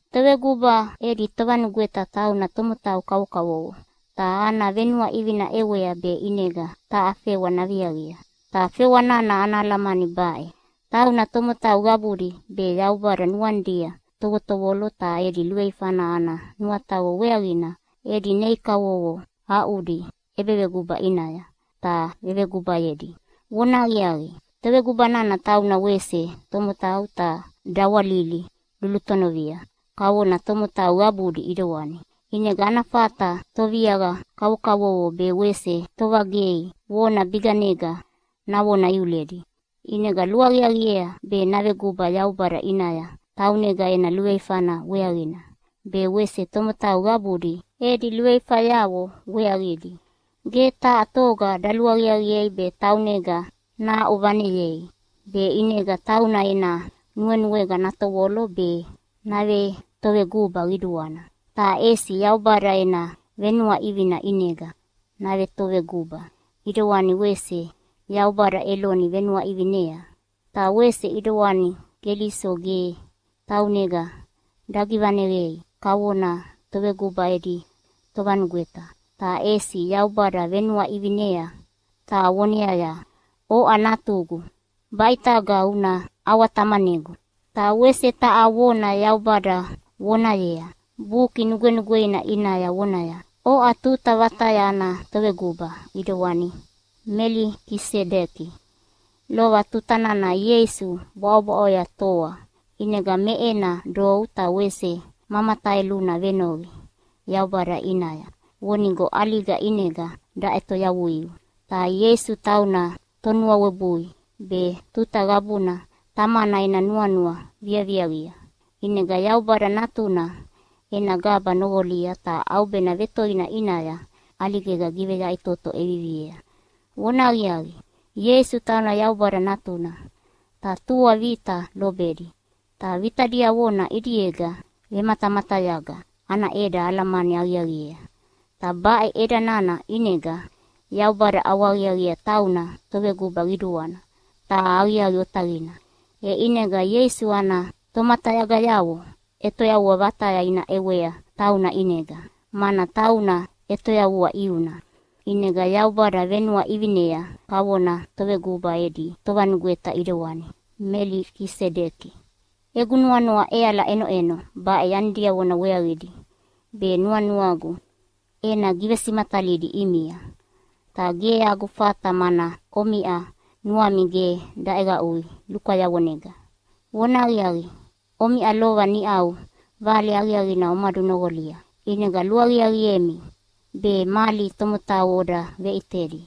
Toveguba edi tovanugweta tauna tomotau kavokavovo ta ana venuaʼivina ʼewea be ʼinega taha fewa naviaqia. Ta fewa nana ana alamani baʼe: Tauna tomotau qabudi be Yaubada nuanidia tovotovolo ta edi luveifana ana nuataqo weaqina edi nei kavovo aʼudi ʼebeveguba ʼinaya ta vevegubayedi. Vonahaqiaqi, toveguba nana tauna wese tomotau ta dawalili lulutonovia kavona tomotau qabudi ʼidewani. ʼInega ana fata toviaqa kavokavovo be wese tovagei vona biganega navona iuledi. ʼInega luaqiaqiea be naveguba Yaubada ʼinaya taunega ena luveifana weaqina be wese tomotau qabudi edi luveifayavo weaqidi. Ge taha toga daluaqiaqiei be taunega nahaʼuvaneyei be ʼinega tauna ena nuenuega natovolo be navetoveguba qiduana. Ta ʼesi Yaubada ena venuaʼivina ʼinega navetoveguba, ʼidewani wese Yaubada Eloni venuaʼivinea. Ta wese ʼidewani Keliso ge taunega dagivaneqei kavona toveguba edi tovanugweta, ta ʼesi Yaubada venuaʼivinea ta voneaya, “Oʼa Natugu, baʼitaga una ʼawatamanegu.” Ta wese taha vona Yaubada vonayea Buki Nugwenugweina ʼinaya vonaya, “Oʼa tuta vataya ana Toveguba, ʼidewani Melikisedeki.” Lova tuta nana Ieisu bwaʼobwaʼoya toa ʼinega me ena dou ta wese ma mataeluna venoqi Yaubada ʼinaya vonigo ʼaliga ʼinega daʼetoyavui. Ta Ieisu tauna tonuawebui be tuta qabuna Tamana ena nuanua viaviaqia, ʼinega Yaubada Natuna ena gaba noqolia ta ʼaubena vetoina ʼinaya ʼaligega giveyaʼitoto ʼeviviea. Vonahaqiaqi, Ieisu tauna Yaubada Natuna, ta tua vita lobedi. Ta vita diavona ʼidiega vematamatayaga ana ʼeda alamani aqiaqiea. Ta baʼe ʼeda nana ʼinega Yaubada ʼawahaqiaqiea tauna Toveguba Qiduana ta aqiaqi otaqina. E ʼinega Ieisu ana tomatayagayavo ʼetoyavua vataya ina ʼewea tauna ʼinega, mana tauna ʼetoyavua ʼiuna. ʼInega Yaubada venuaʼivinea kavona Toveguba edi Tovanugweta ʼidewana Melikisedeki. Egu nuanua ʼeala ʼenoʼeno baʼe yani diavona weaqidi be nuanuagu ena givesimatalidi ʼimia, ta ge agu fata mana omiʼa nuami ge daʼeqaʼui lukwayavonega. Vonahaqiaqi, omiʼa lova niʼau Vale Aqiaqina omadunoqolia, ʼinega luaqiaqiemi be mali tomotau oda veʼitedi.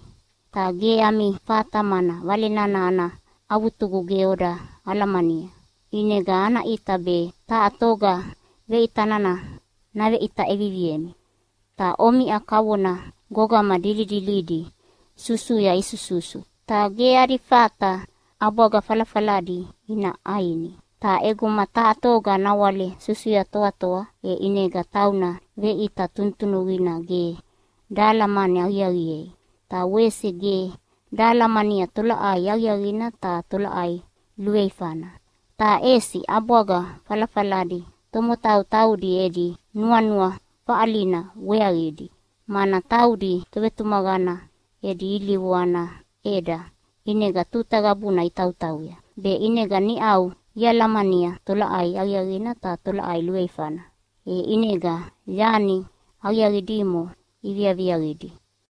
Ta ge ami fata, mana Vale nana ana avutugu ge oda alamania, ʼinega ana ʼita be taha toga veʼita nana naveʼita ʼeviviemi. Ta omiʼa kavona gogama dilidilidi susuya isususu, ta ge adi fata ʼabwaga falafaladi ina ʼaini. Ta ʼeguma taha toga nawale susuya toatoa, e ʼinega tauna veʼita tunutunuqina ge dahalamani aqiaqiei, ta wese ge dahalamania tolaʼai aqiaqina ta tolaʼai luveifana. Ta ʼesi ʼabwaga falafaladi tomotau taudi edi nuanua faʼalina weaqidi, mana taudi tovetumaqana edi ilivu ana ʼeda ʼinega tuta qabuna itautauya, be ʼinega niʼau ialamania tolaʼai aqiaqina ta tolaʼai luveifana. E ʼinega yani aqiaqi dimo iviaviaqidi.